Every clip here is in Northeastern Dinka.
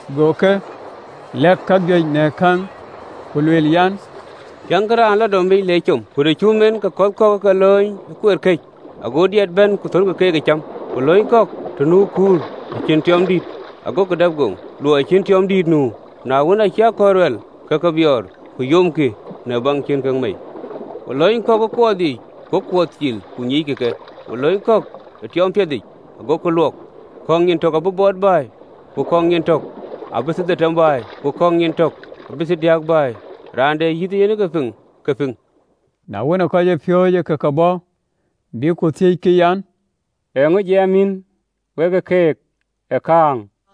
Go ke lɛ̈k kajuëc në kɛ̈ŋ, ku lueel an, “Tiëŋkï, raan ë lɔ domic le com. Ku të wën cum en, ke kɔ̈th kɔ̈k ë ke lööny ë kueer këc, go diɛt bɛ̈n ku thölkï keek ë cäm. Ku lööny kɔ̈th kɔ̈k të nu kur, të cïn tiɔɔm dït, agokï dap goŋ, luɔi cïn en tiɔɔm dït nu. Na wën, acï akɔ̈l ruɛl, ke ke biɔɔr, ku yomkï, në baŋ cïn kek mei. Ku lööny kɔ̈k ë kuɔɔth yiic, go kuɔɔth cil, ku nyiickï ke. Ku lööny kɔ̈k ë tiɔɔm piɛthic, agokï luɔk, kɔ̈k nyin tök abï bɔt bɛ̈ɛ̈i, ku kɔ̈k nyin tök abï thiërdhetem bɛ̈ɛ̈i, ku kɔ̈k nyin tök abï thiërdiäk bɛ̈ɛ̈i.” Raan de yïth ee yen ke piŋ, ke piŋ. Na wën, ke kɔcpiööcë ë ke bɔ̈, bïk ku thiëckï an, “Eeŋö jiɛɛm yïn we keek ë käŋ?”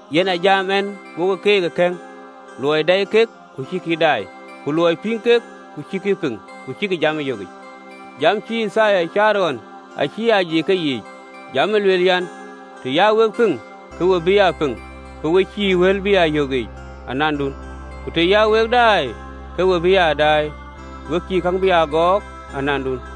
Yen a jam ɛn wo keek ë kɛ̈ŋ, luɔi dɛɛi kek, ku acïkï daai, ku luɔi pïŋ kek, ku acïkï pïŋ, ku cïkï jam ee yökic. (LXX). Jam acï Yithaya caar ɣɔn acï aa yic ë ke yiic, jam ë lueel an, “Të ya wek piŋ, ke we bï aa piŋ, ku we cïï wël bï aa yök yiic anandun. Ku të ya wek daai, ke we bï aa daai, ku we cïï käŋ bï aa gɔɔk anandun.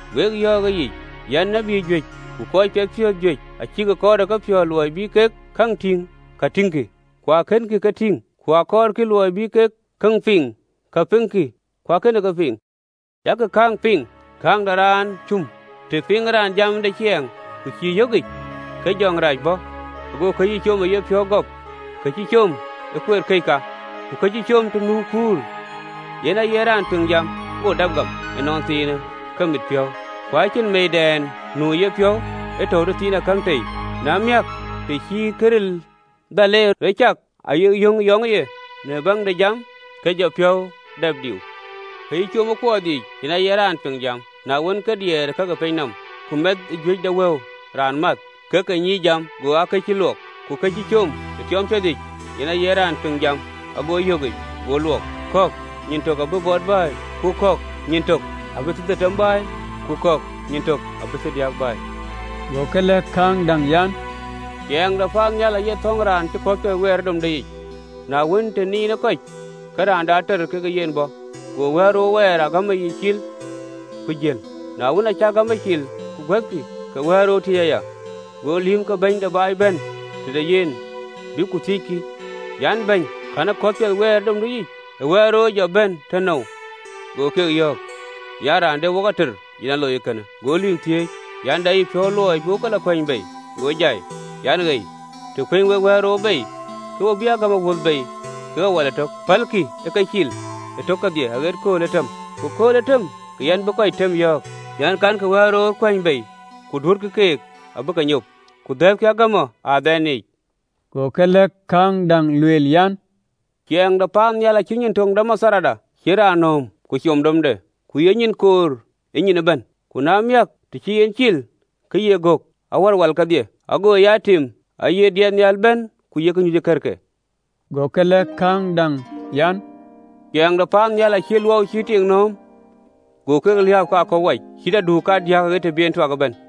Wek yɔ̈ɔ̈k ëyic an, “Tït juëc ku kɔc piɛthpiɔ̈ɔ̈th juëc acïk kɔɔr ë kepiɔ̈ɔ̈th luɔi bï kek käŋ tïŋ ka wɔikï, ku akënkï ke tïŋ, ku akɔɔrkï luɔi bï kek käŋ piŋ ka piɛŋkï, ku akënkï ke piŋ. Jakï kääŋ piŋ kääŋ de raan ë cum. Të piŋë raan jam de ciɛɛŋ, ku cïï ë yökic, ke jɔŋ dïït rac bɔ̈, ago kë cï com ë yepiɔ̈u gɔp. Kë cï com ë kueer këc ka. Ku kë cï com të nu kur, yen aye raan piŋ jam, go dap gam ënɔnthiinë ke mit piɔ̈u, ku acïn meeidɛn nu ë yepiɔ̈u, ee tɔ̈u tëthiinakäŋ tei, na miäk, të cï këril dhal en rɔ cak ayï yöŋ yɔŋ ë ye në biäk de jam, ke jɔ piɔ̈u dap diu. Ku kë cï com ë kuɔɔth yiic, yen aye raan piŋ jam, na wën ke diɛɛr ë ka ke pinyë nɔm, ku mɛth ee juëc de wëu raan math, ke ke nyiic jam, go cïï lok. Ku kë cï com ë tiɔɔm piɛthic, yen aye raan piŋ jam, ago yökic, go luɔk, kɔ̈k nyin tök abï bɔt bɛ̈ɛ̈i, ku kɔ̈k nyin tök abï thiërdhetem bɛ̈ɛ̈i, ku kɔ̈k nyin tök abï thiërdiäk bɛ̈ɛ̈i. Go ke lɛ̈k kääŋ däŋ an, “Ciɛɛŋ de paannhial aye thɔ̈ŋ raan cï kɔ̈th piɛth wɛɛr ë domde yic, na wën, të niin ë kɔc, ke raan de ater ke yen bɔ̈, go wɛ̈ɛ̈l röör wɛɛr ë agamɔ yic cil, ku jël. Na wën, aacï agamɔ cil, ku guɛ̈thkï, ke wɛ̈ɛ̈l röör tiëc aya. Go lïïm ke bɛ̈ny de baai bɛ̈n tëde yen, bïk ku thiëckï an, “Bɛ̈ny, kɛ̈në kɔ̈th piɛth wɛɛr ë domdu yic? Wɛ̈ɛ̈l röör ë jɔ bɛ̈n tënou?” Go keek yɔ̈ɔ̈k, an, “Raan de wok ater yen aa loi ee kënë.” Go lïïm thiëëc, an, “De yïpiɔ̈u luɔi bï wok ke lɔ kuɛny bei?” Go jai, an, “Ei, të kuɛ̈ny wek wɛ̈ɛ̈l röör bei, ke we bï agamɔ wöth bei kekë wäl ëtök. Pälkï ë ke cil ëtök kedhie aɣet kööl ë tëm, ku kööl ë tëm, ke yɛn bï kɔc tëm yɔ̈ɔ̈k, an, Kankï wɛ̈ɛ̈l röör kuɛ̈ny bei, ku duötkï keek abï ke nyop, ku dhɛ̈ɛ̈thkï agamɔ ë adhaandï yic.” Go ke lɛ̈k kääŋ däŋ, lueel, an, “Ciɛɛŋ de paannhial acït nyin töŋ de matharda, cï raan nööm, ku com domic, ku ye nyin koor ë nyin ëbɛ̈n, ku na miäk, të cï en cil, ke ye gök awär wal kedhie, ago ya tim, aye diɛt nhial bɛ̈n ku yek nyuc ë kërke.” Go ke lɛ̈k kääŋ däŋ an, “Ciɛɛŋ de paannhial acït luɔu cï ë tik nööm, go ke liääp kekë aköp wac, cït aduuk kadiäk aɣet të bï en tuak ëbɛ̈n.”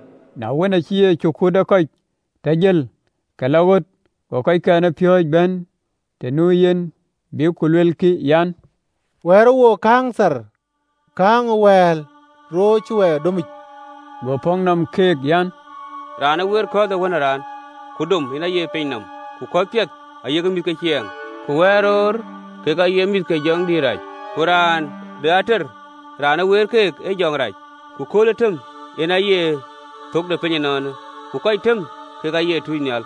Na wën, acï Yecu kut ë kɔc tɔ jël, ke lɔ ɣöt, go kɔckɛn ë piööcë bɛ̈n të nu yen, bïk ku luelkï an, “Wɛ̈ɛ̈rë wook kääŋ thar, kääŋ ë wɛ̈ɛ̈l röör cï wɛɛr domic.” Go pɔ̈k nɔm keek an, “Raan ë weer kɔ̈th piɛth ee Wën ë Raan, ku dom yen aye piny nɔm, ku kɔ̈th piɛth kek aye mïth ke ciɛɛŋ, ku wɛl röör kek aye mïth ke jɔŋ dïït rac, ku raan de ater raan ë weer keek ee jɔŋdït rac, ku kööl ë tëm yen aye thök de piny de ënɔɔnë, ku kɔc tëm kek aye tuunynhial.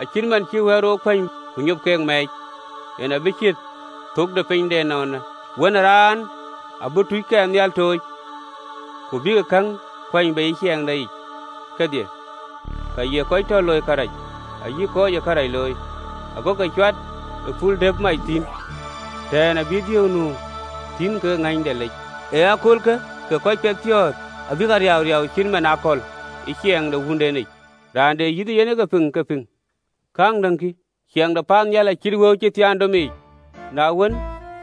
Acït man cï wɛl röör kuany ku nyop ke mɛɛc, yen abï ciët thök de piny de ënɔɔnë. Wën ë Raan abï tuuckɛn nhial tooc, ku abïk käŋ kuɛ̈ny bei ë ciɛɛŋdeyic kedhie ka ye kɔc tɔ loi kërac ayï kɔc ë kërac looi. Agokï ke cuat ë pul dëpë mac thïn, tɛ̈ɛ̈n abï dhiëëu nu thïn kekë ŋëny de lec. Ë aköölkë kɔc piɛthpiɔ̈ɔ̈th abïk a riauriau cït man akɔ̈l ë ciɛɛŋ de Wuöndenic. Raan de yïth ee yen ke piŋ ke pïŋ! Kääŋ däŋ, kï: Ciɛɛŋ de paannhial acït wëu piɛth cï thiaan domic, na wën,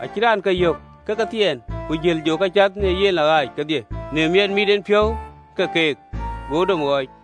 acï raan ke yök, ke ke thiɛɛn, ku jël, jɔ ka cath në yen lɔ ɣaac kedhie në miɛt mit en piɔ̈u ke keek, go domë ɣɔɔc.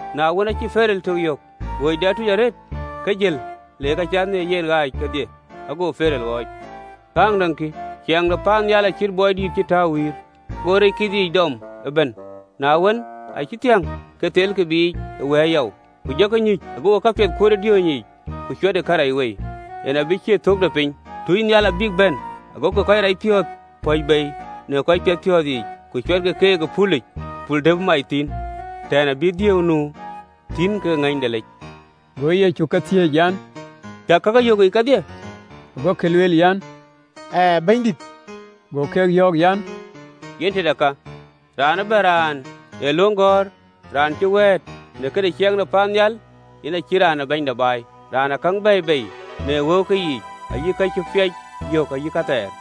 Na wën, aacï awaŋgur tuc ë ɣööcde arëët yök, ke jël, ku le ka cath në yen ɣaac kedhie, ago awaŋgur ɣɔɔc. Kääŋ däŋ kï: Ciɛɛŋ de paannhial acït bɔi dïït cï tääu wïïr, go rec kith yiic dɔm ëbɛ̈n, Na wën, acï thiäŋ, ke thelkï biic ë wɛ̈ɛ̈r yɔu, ku jɔkï nyuc, gokï kapiɛth kuöt ë diööny yiic, ku cuɛtkï karɛc wei. Yen abï ciët thök de piny. Tuucnhial abïk bɛ̈n, agokï kɔc racpiɔ̈ɔ̈th pɔ̈c bei në kɔc piɛthpiɔ̈ɔ̈th yiic, ku cuɛtkï keek ë pulic pul dëpë mac thïn, tɛ̈ɛ̈n abï dhiëëu nu thïn kekë ŋëny de lec. Go Yecu ke thiëëc an, “Cäk kakë yök yiic kedhie?” Gokï lueel an, “Ɣɛɛ, Bɛ̈nydït.” Go ke yɔ̈ɔ̈k, an, “Yen tëde ka, raan ëbɛ̈n raan ë löŋ gɔ̈ɔ̈r raan cï wɛ̈ɛ̈t në këde ciɛɛŋ de paannhial, yen acït raan ee bɛ̈ny de baai, raan ë käŋ bɛ̈ɛ̈i bei në wëuke yiic ayï ka cï piac yök ayï kathɛɛr.”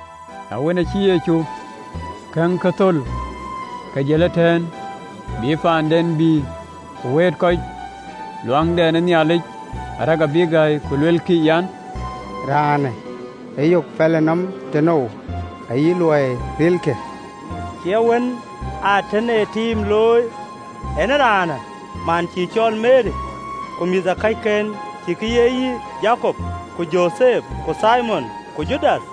Na wën, acï Yecu kɛ̈ŋkë thöl, ke jël ëtɛ̈ɛ̈n, bï paanden, bï ku wëët kɔc luaŋdɛn ë Nhialic, arëk abïk gäi, ku luelkï an, “Raanë ë yök pɛlënɔmë tënou, ayï luɔi rilë?” Cie wën ë atën ë tiim looi en ëraanë? Man cïï cɔl Meri? Ku mïthëkɔcken, cïkï ye yï Jakop, ku Jotheth, ku Thimon, ku Judath?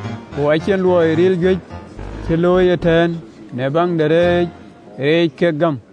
Ku acïn luɔi ril juëc cï looi ëtɛ̈ɛ̈n në baŋ de rɛɛc reec kek gäm.